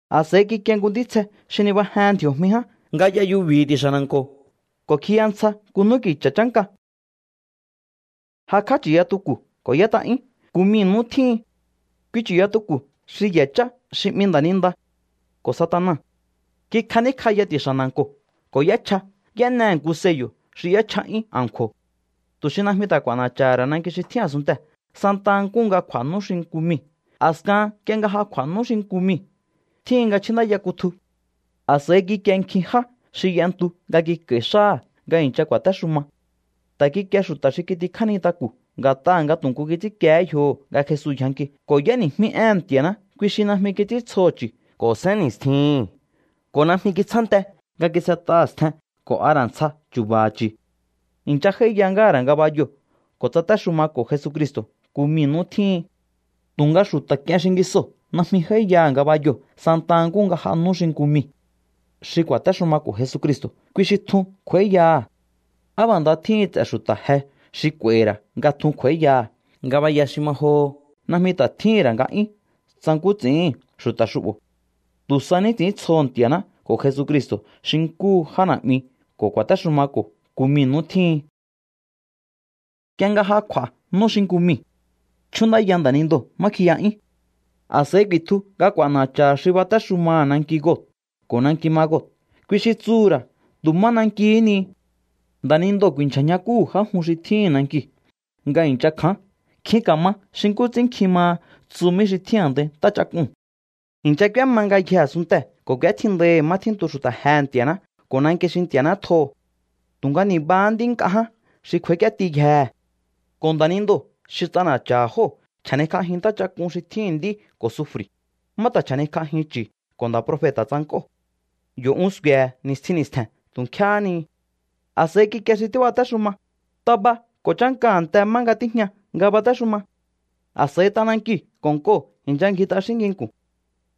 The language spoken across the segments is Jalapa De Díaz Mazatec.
A̱s'a̱i kikie nku ntítsje xi nibajehen ndji̱o̱jmi ján nga y'a yubi̱hi̱ ti̱xa̱ na̱nko̱ ko̱ kjiya ntsja nku n'úki̱cha̱ chánka. Jakj'á chu̱yatuku̱ ko̱ y'ét'a'yún nku mii̱ nú tjíhin. Kui chu̱yatuku̱ xi ye̱ chá xi 'mi nda̱ninda ko̱ Satana. Kikjaníkj'aya ti̱xa̱ na̱nko̱ ko̱ y'échja. Y'énehe̱ nku sello̱ xi y'échja'yún a̱nkju̱o̱ tu̱ xi najmi ta̱ k'u̱a̱na̱cha̱ha̱ ra̱ nanki xi tjín a̱sunntee̱ santa nkúhu nga kj'u̱a̱ nú xi nku miu̱. A̱skahan nk'ie nga ja kj'u̱a̱ nú xi nku miu̱, tjíhin nga chjúndáya kutju. A̱s'a̱i kikie nkjin já xi y'entu nga kik'a̱i̱ xáha̱ nga i̱ncha ku̱a̱téxuma. Ta̱ kikie xu̱ta̱ xi kitikjá nintaku̱ nga̱t'aha̱ nga tu̱ nkú kits'ínkiehé yjoho̱ nga Jesu yjanki ko̱ y'éni̱jmí éhe̱n Nti̱a̱ná. Kui xi najmi kits'íntsjoho̱ chu̱ ko̱ sénni̱stjihi̱n ko̱ najmi kitsjánte nga kis'et'aha̱ stjen ko̱ a ra̱ ntsja chu̱ba̱ha̱ chu̱. I̱ncha j'áíya ngáha̱ ra̱ ngabayoo̱ ko̱ tsatéxumako̱ Jesucristo̱ nku mii̱ nú tjíhin. Tu̱nga xu̱ta̱ k'ien xingisoo̱ najmi j'áíyaha̱ ngabayoo̱ santa nkúhu nga j'a nú xi nku miu̱. Xi ku̱a̱téxumako̱ Jesucristo̱, kui xi tjun kj'u̱a̱íyaha̱. ¡Á b'a̱ nda tjíhin ts'e̱ xu̱ta̱ je xi k'u̱a̱i̱hi̱ ra̱ nga tjun kj'u̱a̱íyaha̱! Ngabaya xi ma joho najmi ta̱ tjíhi̱n ra̱ nga'yún tsa nkú ts'i̱íhi̱n xu̱ta̱ xu'bo̱. Tu̱ sa ní ts'i̱íntsjoho̱ Nti̱a̱ná ko̱ Jesucristo̱ xi nkúhu já na̱'mi ko̱ ku̱a̱téxumako̱ nku mii̱ nú tjíhin. Nk'ie nga ja kj'u̱a̱ nú xi nku miu̱, chjúndáya nda̱nindoo̱ má kjiya'yún. A̱s'a̱i ku̱i̱tju nga k'u̱a̱na̱cha̱ha̱ xi batéxumaha̱ nanki Gog ko̱ nanki Magog, kui xi tsuhu̱ ra̱ tu̱ má nankihí ni. Nda̱nindoo̱ ku̱i̱nchja̱ ñjakúhu̱ já jun xi tjíhi̱n nankiu̱ nga i̱ncha kja̱án. Nkjin ka̱ma xi nkú ts'ín nkjin maha tsumí xi tjín a̱ndai ntáchak'uu̱n. I̱ncha k'úéma ngayjee̱ a̱sunntee̱ ko̱ k'u̱étjindaihi̱ má tjíntu xu̱ta̱ jehe̱ Nti̱a̱ná ko̱ nanki xi Nti̱a̱ná tjoho̱. Tu̱nga ni̱bahá nd'í nk'a ján xi kj'u̱a̱ík'íétiyjehe̱. Ko̱ nda̱nindoo̱ xi ts'ana̱cha̱ha̱ jóo̱ chja̱nikj'ajin ntáchak'un xi tjíhi̱n nd'í ko̱ sufri̱, má ta̱ chja̱nikj'ajin chu̱ ko̱ nda̱ profeta̱ tsank'óo̱. Yo̱ un sku̱e̱he̱ ni̱stjin ni̱stje̱n tu̱ nkjéhé nihi. A̱s'a̱i kikie xi tíbatéxuma. Taba ko̱ chánka a̱nte má nga tíjña nga batéxuma. A̱s'a̱i t'anankiu̱ ko̱ nk'oo̱ i̱ncha ngji t'axín nginku̱n.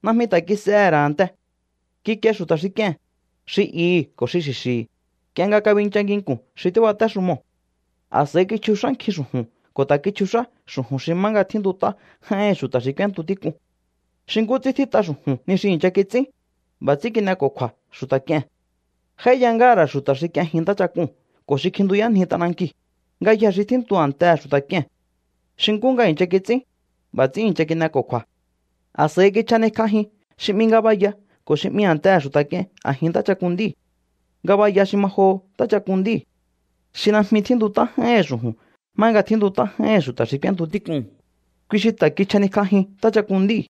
Najmi ta̱ kis'ehe̱ ra̱ a̱nte. Kikie xu̱ta̱ xi k'ie̱n, xi ihi̱ ko̱ xi xi̱xi̱hi̱, nk'ie nga kabincha nginku̱n xi tíbatéxumoo̱. A̱s'a̱i kichjux'á nkjin xu̱ju̱n ko̱ ta̱ kichjux'á xu̱ju̱n xi má nga tjíntut'á j'áíhi̱n xu̱ta̱ xi k'úéntu tík'un. Xi nkú ts'ín tjít'a xu̱ju̱n ni xi i̱ncha kits'ín, b'a̱ ts'ín kin'eko̱kju̱a̱ xu̱ta̱ k'ie̱n. J'áíya ngáha̱ ra̱ xu̱ta̱ xi k'ienjin ntáchak'uu̱n ko̱ xi kjintuyánji t'anankiu̱, ngayjee̱ xi tjíntu a̱ntehe̱ xu̱ta̱ k'ie̱n. Xi nkú nga i̱ncha kits'ín, b'a̱ ts'ín i̱ncha kin'eko̱kju̱a̱. A̱s'a̱i kichjanikj'ajin xi 'mi Ngabaya ko̱ xi 'mi A̱ntehe̱ Xu̱ta̱ K'ie̱n a̱jin ntáchak'un nd'íu̱. Ngabaya xi ma joho ntáchak'un nd'íu̱. Xi najmi tjíntut'á j'áíhi̱n xu̱ju̱n má nga tjíntut'á j'áíhi̱n xu̱ta̱ xi k'úéntu tík'uu̱n, kui xi ta̱ kichjanikj'ajin ntáchak'un nd'íu̱.